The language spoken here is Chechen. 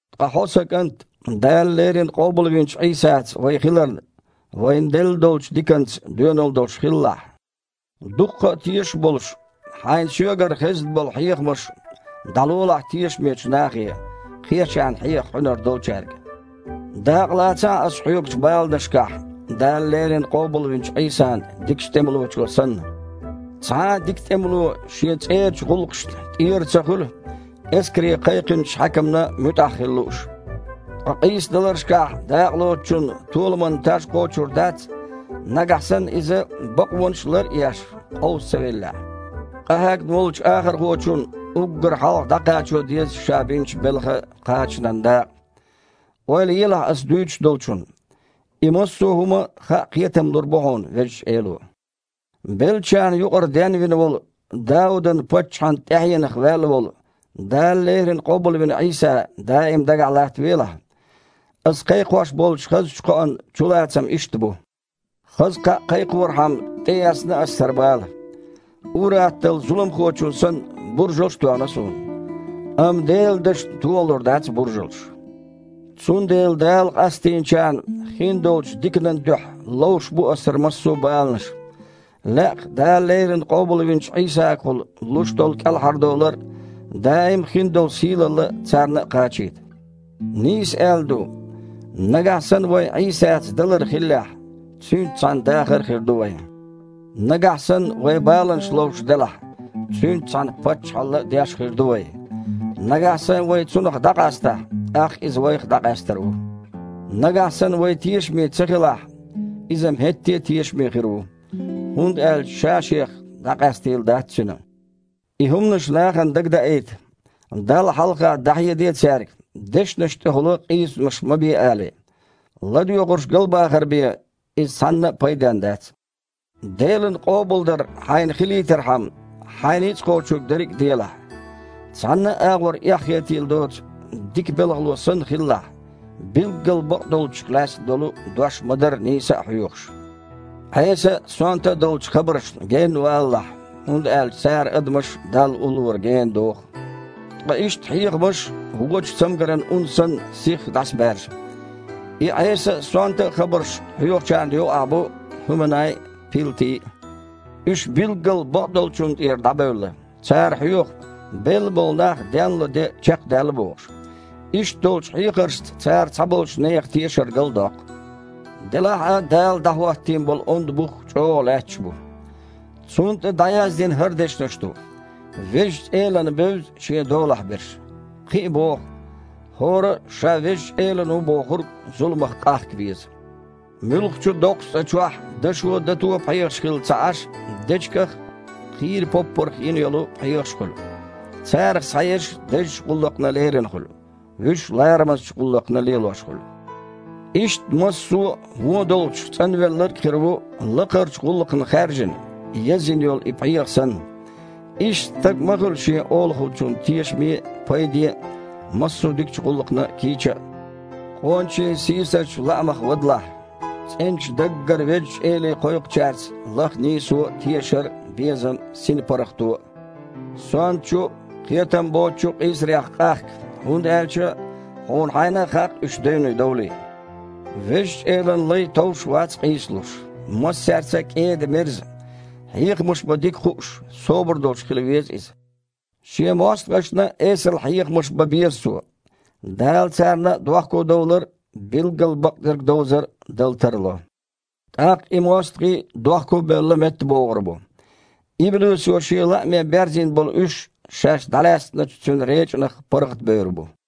Ткъа хьо, сан кІант, Дала леррина къобалвинчу Іийсаца вай хиларна, вайна делла долчу диканца доьналла долуш хилалахь. Дуккха а тешаш а болуш, хьайна соьгара хезна болу хьехамаш дІалолахь тешамечу нахе, кхечарна хьеха хьуьнар долчаьрга. Дакъалацахьа ас хьоьгучу баланашкахь, Дала леррина къобалвинчу Іийсан дикачу тІемалочо санна. Цхьа а дика тІемало шен цІерачу гІуллакхашна тІера ца хуьлу, эскаре кхайкхинчу хьаькамна муьтІахь хила лууш. Ткъа къийсадаларшкахь дакъалоцучунна толаман таж кхочур дац, нагахь санна иза, бакъонаш лар а еш, къовса ца веллехь. Къахьегна волчу ахархочунна уггар хьалха дІакхачо деза ша бинчу белхан кхачанан дакъа. Ойла елахь аса дуьйцуш долчун. И массо а хІума хаа кхетам лур бу хьуна Везачу Эло. Беллачарна юкъара денвина волу, Дауд-паччахьан тІаьхьенах ваьлла волу Дала леррина къобалвина Іийса даим дагахь латтавелахь. Ас кхайкхош болчу хазачу кхоан чулацам иштта бу. Хаза кхаъ кхайкхорхьама тІеэцна ас хІара бала. Ур-атталла, зуламхочунна санна, буржалш а тоьхна суна. Амма Делан дашна тохалур дац буржалш. Цундела Дала къастийначарна хиндолчу диканан дуьхьа ловш бу аса хІара массо а баланаш. Лаьа-кх Дала леррина къобалвинчу Іийсагахула луш долу кІелхьардовлар а, даим а хиндолу сийлалла а царна а кхачийта. Нийса аьлла ду: «Нагахь санна вайн Іийсаца далар хиллехь, Цуьнца цхьаьна дахар а хир ду вайн. Нагахь санна вай баланаш ловш делахь, Цуьнца цхьаьна паччахьалла деш а хир ду вай. Нагахь санна вай Цунах дІакъастахь, тІаккха Иза а вайх дІакъаьстар ву. Нагахь санна вай тешаме ца хилахь а, Иза-м хІетте а тешаме хир ву, хІунда аьлча Ша-Шех дІакъаьстийла дац Цуьнан». И хІуманаш нахана дагадаийта. Далла хьалха дІахьеде цаьрга, дешнаш тІехула къийсамаш ма бе алий. ЛадоьгІурш галбахар бен, иза цхьанна а пайденна дац. Делан къобалдар хьайна хилийтархьама, хьайн ницкъ кхочург дерриг а делахь. Цхьанна а агІор эхь хетийла доцу дика белхало санна хилалахь, билггал бакъдолчух лаьцна долу дош ма-дарра нийса а хьоьхуш. Іеса а, сонта а долчу хабаршна генна валалахь, хІунда аьлча цара адамаш Далла уллора гена доху. Ткъа иштта хьехамаш, вочу цамгаран ун санна, сихха дІасабаьржа. И Іеса а, сонта а хабарш хьоьхучарна юкъахь бу ХІуьманай а, Пилти а. Уьш билггал бакъдолчунна тІера дІабевлла. Цара хьоьху, белла болу нах денло де чекхдаьлла бохуш. Иштта долчу хьехаршца цара цхьаболчу нехан тешар галдоккху. Делахь а Дала дІахІоттийна болу онда бух чІогІа лаьтташ бу. Цунна тІе дІаяздина хІара дешнаш ду: «Везачу Элана бевза Шен долахь берш». Кхин а боху: «ХІора а, ша Везачу Элан ву бохург, зуламах къахка веза». Муьлххачу а доккхачу цІа чохь дашо а, дато а пхьегІаш хилла а ца Іаш, дечигах а, кхийра поппарх а йина йолу пхьегІаш а хуьлу. Царах цхьаерш дезачу гІуллакхна лерина хуьлу, вуьш ларамазчу гІуллакхна лелош хуьлу. Иштта массо а вон долчух цІанвелларг а хир ву лакхарчу гІуллакхна хаьржина, язйина йолу и пхьегІа санна. Иштта стаг а ма хуьлу шен Олахочунна тешаме а, пайден а, массо а дикачу гІуллакхна кийча а. Къоначийн сийсазчу лаамех вадалахь. ЦІеначу даггара Везачу Эле кхойкхучаьрца лаха нийсо а, тешар а, безам а, синан паргІато а. Сонтачу а, кхетамбоцучу а къийсарех къахка, хІунда аьлча хьуна хьайна а хаьа-кх уьш девне довлий. Везачу Элан лай товш вац къийсалуш. Массаьрца а кІеда-мерза, хьехамаш бан дика хууш, собар долуш хила веза иза. Шен мостагІашна а эсала хьехамаш бан беза цо. Дала царна а дохкодовлар а, билггал бакъдерг довзар а дала тарло. ТІаккха и мостагІий а, дохко а бевлла, меттабогІур бу. Иблисо шен лааме берзийна болу уьш шаьш дІалаьцначу цуьнан речІанах паргІатбевр бу.